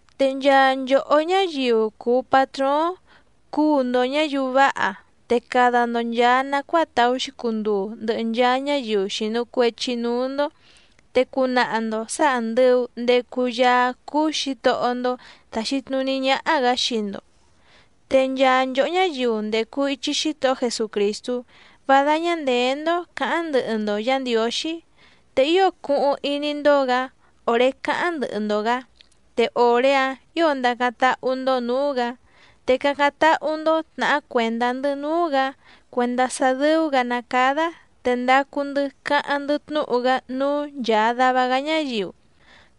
Te nchaa nchòhó ñáyiu cùu patróóⁿ cuu‑ndo ñǎyiu váha, te cada‑ndo nchàa nacuáa tàú‑xi cunduu ndɨhɨ nchaa ñáyiu xìnu cuechi núú‑ndó, te cunaha‑ndo sǎ àndɨu ndecu Yaá cúú Xǐtohó‑ndó tàxi tnuní ñáhá‑gǎ xii‑ndo. Te nchaa nchòhó ñáyiu ndècu ichi Xítohó Jesucrìstú, vá dáñá ndèé‑ndó cǎháⁿ ndɨhɨ‑ndo Yǎ Ndiǒxí, te ío cuhuⁿ iní‑ndó‑gǎ òré càháⁿ ndɨhɨ‑ndo‑gǎ, te òré‑áⁿ ǐo ndacáⁿ táhú‑ndó nǔú‑gǎ. Te cácáⁿ táhú‑ndó tnàhá cuèndá‑ndɨ́ núú‑gǎ cuèndá sá dɨ́ú‑gǎ ná cádá te ndacu‑ndɨ́ cáháⁿ‑ndɨ́ tnúhu‑gá núú nchàa dava‑gá ñáyiu,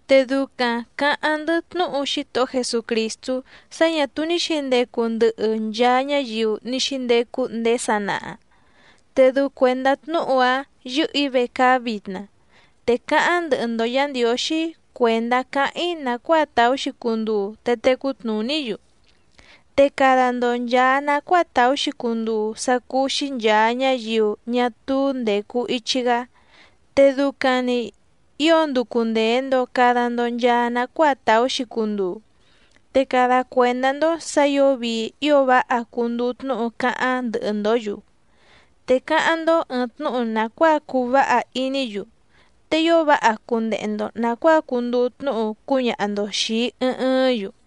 te ducaⁿ cǎháⁿ‑ndɨ́ tnúhu Xítohó Jesucrìstú sá ñǎ túú ní xǐndecu ndɨhɨ nchaa ñáyiu ní xíndecu ndéé sanaha, te dɨu cuèndá tnúhu‑áⁿ yɨ́hɨ̀‑í vecaá vitna. Te cáháⁿ ndɨhɨ‑ndo Yǎ Ndiǒxí cuèndá cáháⁿ‑í nàcuáa tàú‑xi cunduu te tecú tnùní‑yu. Te cada‑ndo nchàa nacuáa tàú‑xi cunduu sá cúú‑xí nchàa ñáyiu ñá túú ndècu ichi‑gá, te ducaⁿ‑ni ǐo nducu ndèe‑ndo cada‑ndo nchaa nacuáa tàú‑xi cunduu. Te cada cuèndá‑ndó sǎ ǐo vii ío váha cunduu tnúhu cáháⁿ ndɨhɨ‑ndǒ‑yu, te cáháⁿ‑ndó ɨ̀ɨⁿ tnúhu nàcuáa cuu váha iní‑yu, te ío váha cundehe‑ndo nàcuáa cunduu tnúhu cúñaha‑ndo xìi ɨɨⁿ ɨɨ́ⁿ‑yu.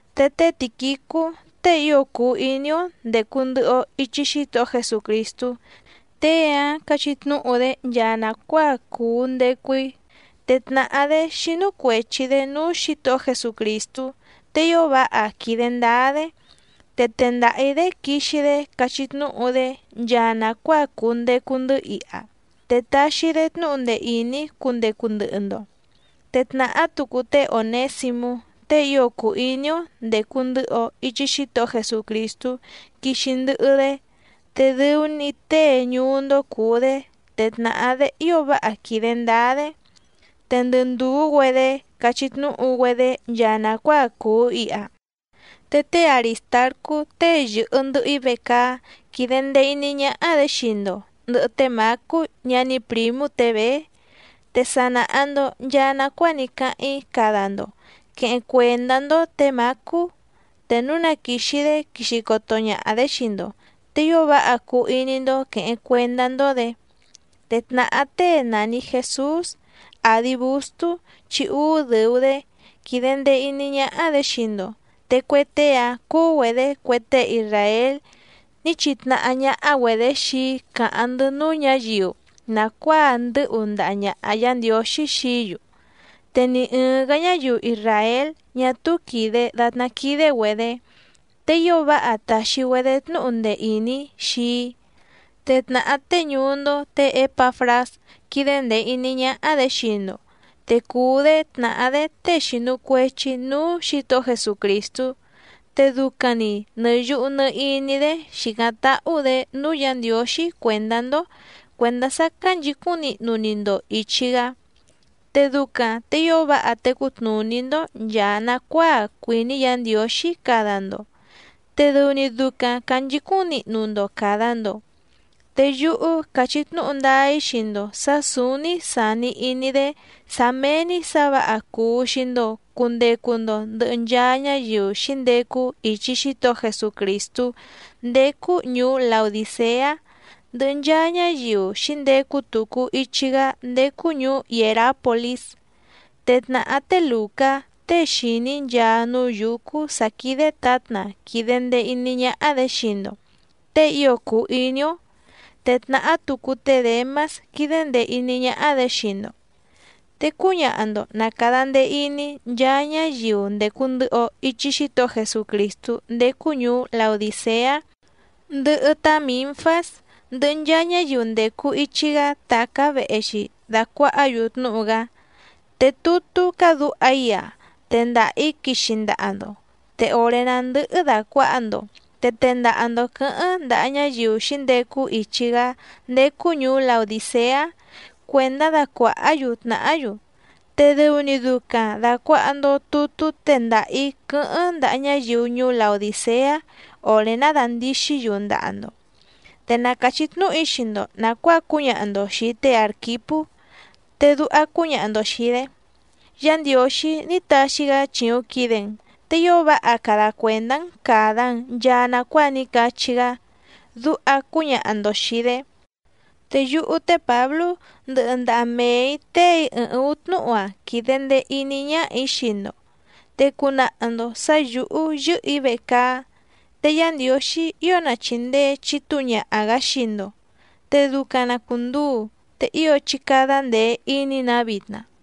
Te té Tìquicú tée ío cùu iní‑ó ndècu ndɨhɨ‑o ichi Xítohó Jesucrìstú, tée‑áⁿ cachí tnúhu‑dé nchaa nàcuáa cùu ndecu‑í. Te tnàhá‑dé xínú cuèchi‑dé núú Xǐtohó Jesucrìstú te ío váha quìde ndáá‑dé. Te tendaha‑ǐ‑dé quixi‑dé cachí tnúhu‑dé nchaa nàcuáa cùu ndecu‑ndɨ́ iha, te taxi‑dé tnúhu ndee ìní cundecu ndɨhɨ‑ndo. Te tnàhá tucu té Ònésimú tée ío cùu iní‑ó ndècu ndɨhɨ‑o ichi Xítohó Jesucrìstú quixi ndɨhɨ‑dé, te dɨu‑ni tée ñuú‑ndó cùu‑dé te tnàhá‑dé ío váha quìde ndáá‑dé. Te ndɨ ndùú‑güedé cachí tnúhu‑güedé nchaa nàcuáa cùu iha. Te té Arìstarcú tée yɨ̀hɨ ndɨhɨ‑í vecaá quídé ndèe iní ñáhá‑dě xii‑ndo ndɨ̀hɨ té Mǎcú ñaní prǐmú tě Bèé. Te sa nàha‑ndo nchaa nacuáa ní cáháⁿ‑í cada‑ndo quèheⁿ cuendá‑ndó tě Mǎcú, te núu na quìxi‑dé quixi coto ñaha‑dě xii‑ndo, te ío váha cuu iní‑ndó quèheⁿ cuendá‑ndó‑dě. Te tnàhá tée nàni Jesús, àdi Bustú chi úú dɨ̀u‑dé, quídé ndèe iní ñáhá‑dě xii‑ndo. Te cue tée‑a cùu‑güedé cue tée isràél ní chitnahá ñáhá‑güedě xii‑í càháⁿ‑ndɨ́ núú ñǎyiu nàcuáa ndɨ́hu ndaha ñàha Yá Ndiǒxí xií‑yu, te ni ɨ̀ɨⁿ‑gá ñáyiu isràél ñá túú quìde datná quídé‑güedě. Te ío váha tàxi‑güedé tnúhu ndee ìní xii‑í. Te tnàhá tée ñuú‑ndó tě Ěpafrás quídé ndèe iní ñáhá‑dě xii‑ndo, te cùu‑dé tnàhá‑dé tée xìnu cuechi núú Xǐtohó Jesucrìstú. Te ducaⁿ‑ni nɨ̀ yuhu nɨ iní‑dé xìcáⁿ táhú‑dě núú Yǎ Ndiǒxí cuèndá‑ndó cuèndá sá cánchǐcúⁿ nihnu‑ni‑ndo ìchi‑gá, te ducaⁿ te ío váha tecú tnùní‑ndó nchàa nacuáa cuìní Yǎ Ndiǒxí cada‑ndo, te dɨu‑ni ducaⁿ cànchicúⁿ nihnu‑ndo càda‑ndo. Te yúhú càchí tnúhu ndáá‑í xii‑ndo sǎ sǔúní sàni iní‑dé sá méé‑ní sǎ vǎha cuu xii‑ndo cùndecu‑ndo ndɨhɨ nchaa ñáyiu xǐndecu ichi Xítohó Jesucrìstú ndécú ñùú Laodìceá, ndɨhɨ nchaa ñáyiu xǐndecu tucu ichi‑gá ndécú ñùú Hièrápolís. Te tnàhá té Lùcá tée xìní nchaa núú yǔcú sǎ quídé tǎtna quìde ndee iní ñáhá‑dě xii‑ndo tée ío cùu iní‑ó, te tnàhá tucu té Děmás quídé ndèe iní ñáhá‑dě xii‑ndo. Te cúñaha‑ndo na càda ndee iní nchaa ñáyiu ndècu ndɨhɨ‑o ichi Xítohó Jesucrìstú ndécú ñùú Laodìceá, ndɨhɨ tá Mǐnfás, ndɨhɨ nchaa ñáyiu ndècu ichi‑gá tàcá vehe‑xi dàcuahá‑yu tnúhu‑gá. Te tutú cádǔha‑í‑a tendaha‑ǐ quixi ndaha‑ndo, te òré ná ndɨ́hɨ́ dàcuaha‑ndo te tendaha‑ndo quɨ̌hɨ́ⁿ ndaha ñáyiu xǐndecu ichi‑gá ndécú ñùú Laodìceá cuèndá dacuàhá‑yu tnàhá‑yu. Te dɨu‑ni ducaⁿ dàcuaha‑ndo tutú tendaha‑ǐ quɨ́hɨ́ⁿ ndaha ñáyiu ñuú Laodìceá òré ná dàndixí‑yu ndaha‑ndo. Te na càchí tnúhu‑í xii‑ndo nàcuáa cúñaha‑ndo xìi té Àrquipú, te duha cúñaha‑ndo xìi‑dé: “Yá Ndiǒxí ní taxi‑gá chìuⁿ quide‑n, te ío váha cada cuèndá‑n càda‑n nchaa nacuáa ní cachí‑gá”, duha cúñaha‑ndo xìi‑dé. Te yúhú té Pǎblú ndɨhɨ ndaha mee‑ǐ téè‑í ɨɨⁿ ǔú tnúhu‑a quìde ndee iní ñáhà‑í xii‑ndo, te cunaha‑ndo sǎ yǔhú yɨ́hɨ̀‑í vecaá. Te Yá Ndiǒxí ío na chìndee chitúu ñaha‑gǎ xii‑ndo. Te ducaⁿ na cùnduu. Te ío chí cádá ndèe iní‑nǎ vitna.